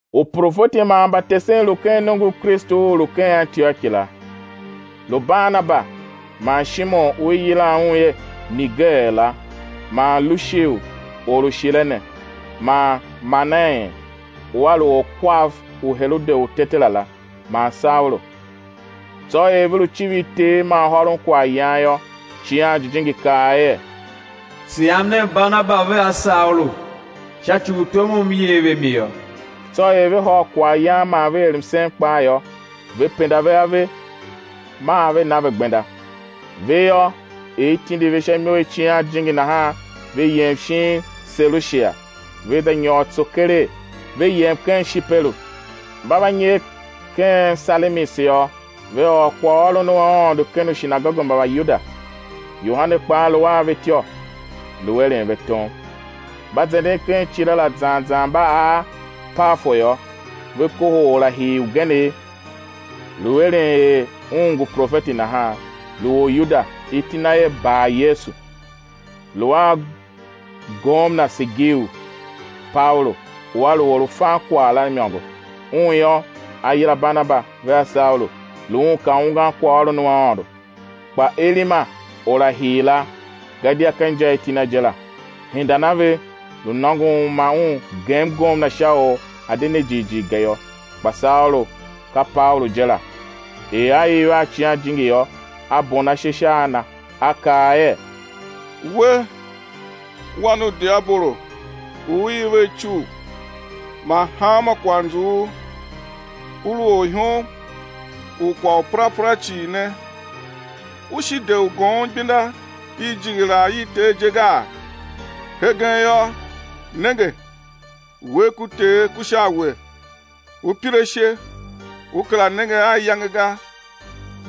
Uprofeti man mbatesen lu ken nongo u Kristu u u lu ken Antioki la, lu: Barnaba man Shimeon u i yilan er Niger la, man Lushiu or u Shirene, man Manaen u a lu orkwav u Herode u Tetera la, man Saulu. Tsô er ve lu civir Ter, man hôron kwaghyan yô, Icighan Jijingi kaa er: Tsegham nen Barnaba vea Saulu sha ci u tom u M yer ve mi yô. Tsô er ve hôr kwaghyan man ve er msen kpaa yô, ve penda ve ave, maa ve na ve gbenda. Ve yô, er i tindi ve sha imo i Icighan Jijingi nahan, ve yem shin Selushia, ve za nyôr tso keregh, ve yem ken Shiperu. Mba va nyer ken Salamis yô, ve ôr kwaghôron u Aôndo ken ushinagoge mba Mbayuda; Yohane kpaa lu a ve ityô, lu eren ve tom. Mba zenden ken icile la cii zan zan mba ar Pafo yô, ve kohol orahir ugenegh, lu eren er un ngu profeti nahan, lu Oryuda, iti na er Baryesu. Lu a gomna Sergiu Paulu u a lu or u fan kwagh la imôngo. Un yô, a yila Barnaba vea Saulu, lu un ka ungwan kwaghôron u Aôndo. Kpa Elima, orahir la—gadia ka inja i iti na je la—hendan a ve; lu nôngon u ma un gem gomna sha u a̱ de ne jighjigh ga yô. Kpa Saulu, ka Paulu je la, er a iv a Icighan Jijingi yô, a bon ashe sha a na a kaa er: We, wan u diabolo u u iv a icugh man hanma kwaghnzughul, u lu orihom u kwagh u perapera cii ne, u shi de u goom igbenda i jighilaa i Ter je gaa? Hegen yô, nenge, uwegh ku Ter ku sha a we, ú pir ashe, ú kera nenge a iyange ga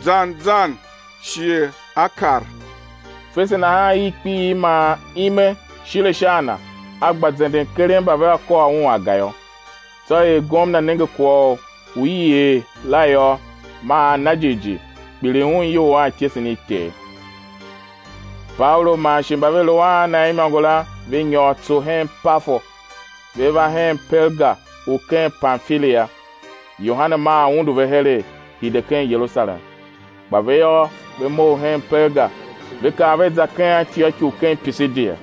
zan zan shighe á kar. Fese nahan, irkpiigh man ime shile sha a na, a gba zenden, keren mba vea kôr un aga yô. Tsô er gomna nenge kwagh u i er la yô, maa a na jighjigh kpiligh un iyol a ityesen i Ter. Paulu man shi mba ve lu a na imôngo la, ve nyôr tso hen Pafo, ve va hen Perga u ken Pamfilia. Yohane maa undu ve heregh, hide ken Yerusalem. Kpa ve yô, ve mough hen Perga ve kar ve za ken Antioki u ken Pishidia.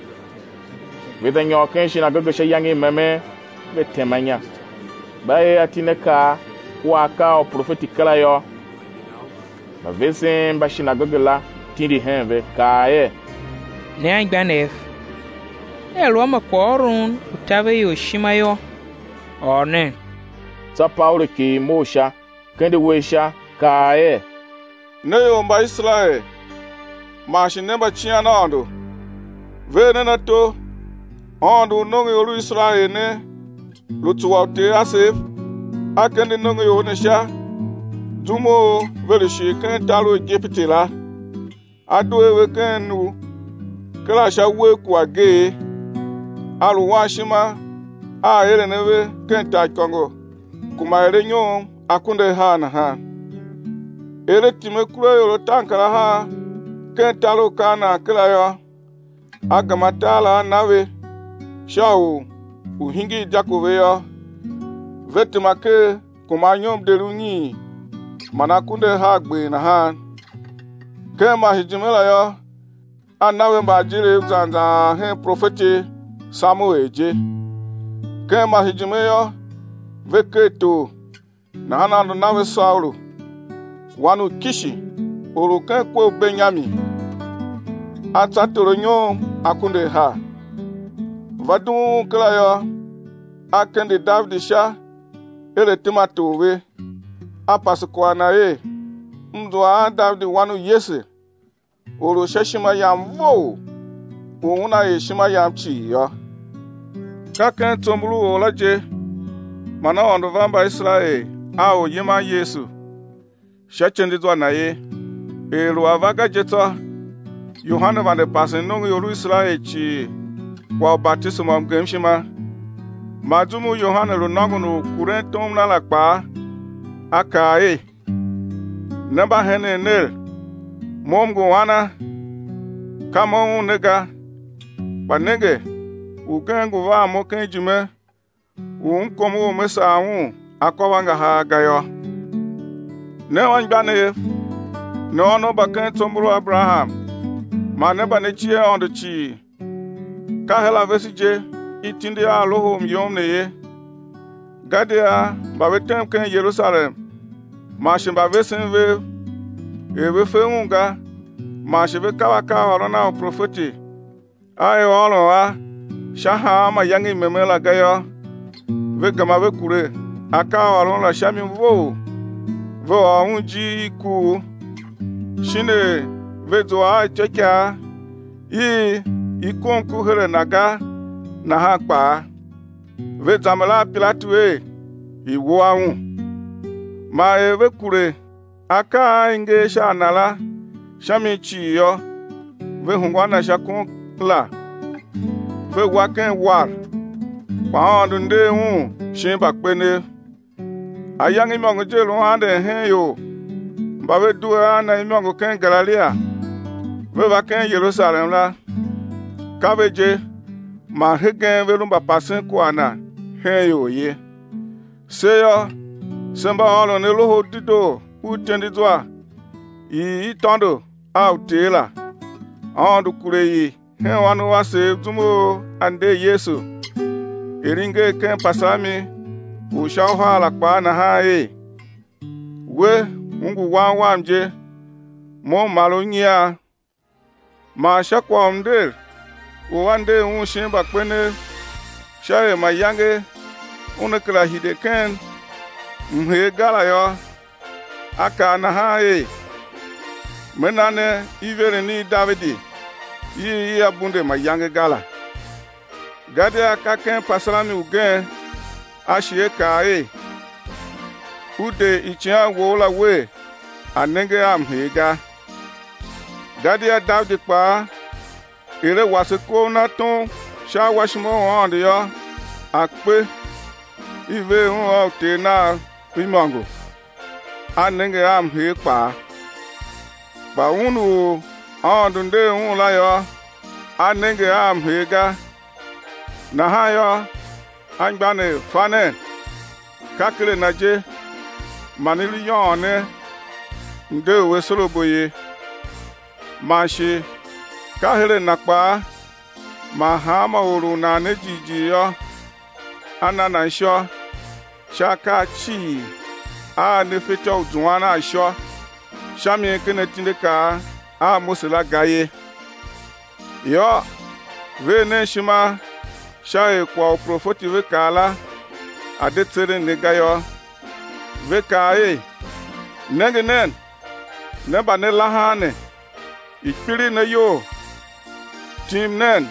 Ve za nyôr ken shinagoge sha iyange i memen, ve tema inya. Mba er atindiakaa kua akaa a uprofeti kera yô, mbavesen mba shinagoge la tindi hen ve, kaa er: Ne anmgbianev, nea lu a ma kwaghôron u taver ior ishima yô, ôr nen. Tsô Paulu kighir mough sha, kende uwegh sha, kaa er: Ne ior mba Iserael man shi ne mbacian Aôndo, ver nen ato. Aôndo u nongoior u Iserael ne, lu tsuwa uter asev, A kende nongoior ne sha zum u ve lu shir ken tar u Igipiti la, a due a ve ken u kera sha uwegh ku ageegh. A lu wan ishima a aeren a ve ken taaikôngo kuma er anyom akunduahar nahan. Er A tim akuraior ataankarahar ken tar u Kanaan kera yô, A gema tar la A na ve sha u u̱ hingir dyako ve yô, ve tema ker kuma anyom deri unyiin man akunduahargber nahan. Ken masejime la yô, A na ve mbaajiriv zan zan ar hen profeti Samuel je. Ken masejime yô, ve ker tor; nahan Aôndo na ve Saulu, wan u Kishi, or u ken kwe u Benyamin, a tsa tor anyom akunduahar. Va dughun un kera yô, A kende Davidi sha er a̱ tema tor ve, A pase kwagh na er: M zua aa Davidi, wan u Yese, or u sha ishima Yam vough, u una er ishima Yam cii yô. Ka ken tsombor u or la je man Aôndo va Mbaiserael a Oryiman Yesu, sha ityendezwa Na ye; er lu a va ga je tsô, Yohane vande pasen nongoior u Iserael cii kwagh u batisema u mgemshima. Man zum u Yohane lu nôngon u kuren tom na la kpaa, a kaa er: Ne mba henen ner, mo m ngu ana? Ka mo Un ne ga, kpa nenge, Ugen ngu van mo ken ijime u m kom u me sagh Un akôvangahar ga yô. Ne anmgbianev, ne ônov mba ken tsombor u Aberaham man ne mba ne cie Aôndo cii, ka her a vese je i tindi a loho u myom ne ye. Gadia mba ve tem ken Yerusalem man shi mbavesen vev, er ve fe Un ga, man shi ve kav akaaôron a uprofeti a i ôron a sha hanma iyange i memen la ga yô, ve gema ve kure akaaôron la sha mi vough ve ôr Un ijir i kuugh; shin er ve zua a ityôikaa i i kom ku her a Na ga nahan kpaa, ve zamber a Pilatu er, i̱ wua Un. Man er ve kure akaa a i nger sha a Na la sha mi cii yô, ve hungwa a Na sha kon la, ve wa ken uwar. Kpa Aôndo nder Un shin mbakpenev. Ayange imôngo je lu anden hen ior mba ve due a Na imôngo ken Galilia, ve va ken Yerusalem la, ka ve je man hegen ve lu mbapasen kwagh Na hen ior ye. Se yô, se mba ôron ne Loho u Dedoo u ityendezwa i i tôndo a uter la; Aôndo kure i hen ônov asev zum u A nder Yesu, er i nger ken Pasalmi u sha uhar la kpaa nahan er: We, U ngu Wan Wam je; Mo M mar u nyian. Man sha kwagh u mnder u A nder Un shin mbakpenev sha er mayange Una kera hide ken mhee ga la yô, A kaa nahan er: Me na ne iveren i Davidi i ia bunde mayange ga la. Gadia ken Pasalmi ugen A shi A kaa er: Ú de Icighan Wou la Wer, A̱ nenge a mhee ga. Gadia Davidi kpaa er a wase kov na tom sha awashima u Aôndo yô, a kpe, i ver un a uter nav imôngo, a nenge a mhee kpaa. Kpa Un u Aôndo nder Un la yô, a nenge a mhee ga. Nahan yô, anmgbianev, fa nen, ka ken a Na je man i lu yôôn ne mde u asorabo ye, man shi ka her a na kpaa man hanma or u nan ne jighjigh yô, á na nan ishô sha akaa cii a ne fetyô u zuan a ishô sha mi ken atindiakaa a Mose la ga ye. Yô, ver nen ishima sha er kwagh u uprofeti ve kaa la a̱ de tseren ne ga yô; ve kaa er: Nenge nen, ne mba ne lahan ne, i̱ kpiligh ne iyol, tim nen,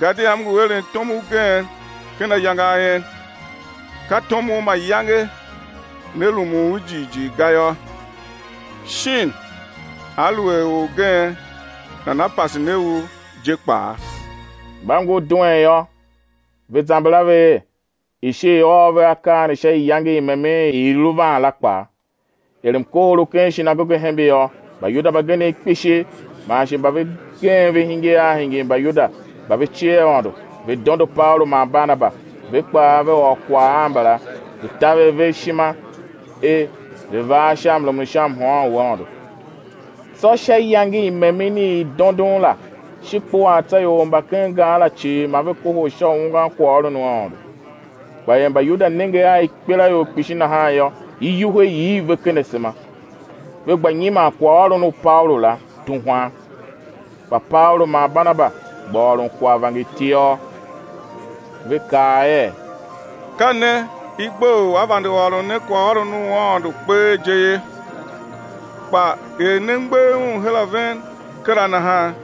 gadia M ngu eren tom ugen ken ayange a en; ka tom u mayange né rumun u jighjigh ga yô, shin aluer orgen nana pase ne u je kpaa. Mba ngur duen yô, ve zamber a ve er: i̱ shi i̱ ôr ve akaa ne sha iyange i memen i i lu van la kpaa. Er mkohol u ken shinagoge hembe yô, Mbayuda mbagenev kpishi man shi mba ve gem ve hingir a hingir Mbayuda mba ve cie Aôndo, ve dondo Paulu man Barnaba; ve kpaa, ve ôr kwagh a mbala, ve taver ve ishima er ve̱ var sha mrumun u sha mhôôn u Aôndo. Tsô sha iyange i memen i dondon la, shi kpuaa tsô ior mba ken gar la cii ma ve kohol sha u ungwan kwaghôron u Aôndo. Kpa er Mbayuda nenge a ikpelaior kpishi nahan yô, iwuhe iv ve ken asema, ve gba nyiman kwaghôron u Paulu la, tuhwan. Kpa Paulu man Barnaba gba ôron kwagh vangertiôr. Ve kaa er: Ka ne i gbe u á vande ôron ne kwaghôron u Aôndo kpee je ye. Kpa er ne mgbegh un her a ven kera nahan,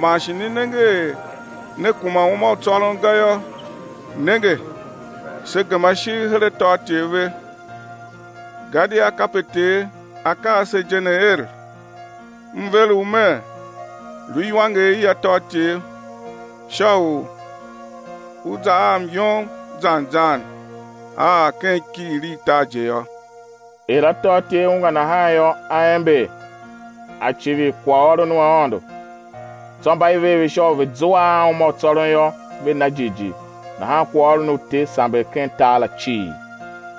man shi ne nenge er ne kuma uma u tsôron ga yô, nenge, se gema ishigh her atôatyev ve. Gadia kape Ter A kaa se je ne, er: M ver U Mer, lu iwanger i atôatyev, sha u U za a myom zan zan á ar ken ikighir i tar je yô. Er atôatyev ungwa nahan yô, a ember, a civir kwaghôron u Aôndo. Tsô mba i ver ve sha u ve̱ zua a uma u tsôron yô, ve na jighjigh. Nahan kwaghôron u Ter samber ken tar la cii.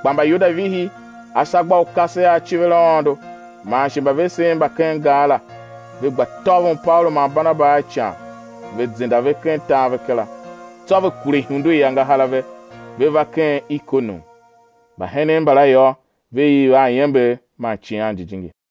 Kpa Mbayuda vihi ashagbaukase a civir Aôndo man shi mbavesen mba ken gar la, ve gba tôvon Paulu man barnaba a ican, ve zenda ve ken tar ve kera. Tsô ve kure ihundu i angahar a ve, ve va ken Ikonium. Mbahenen mbala yô, ve iv a iember man Icighan Jijingi.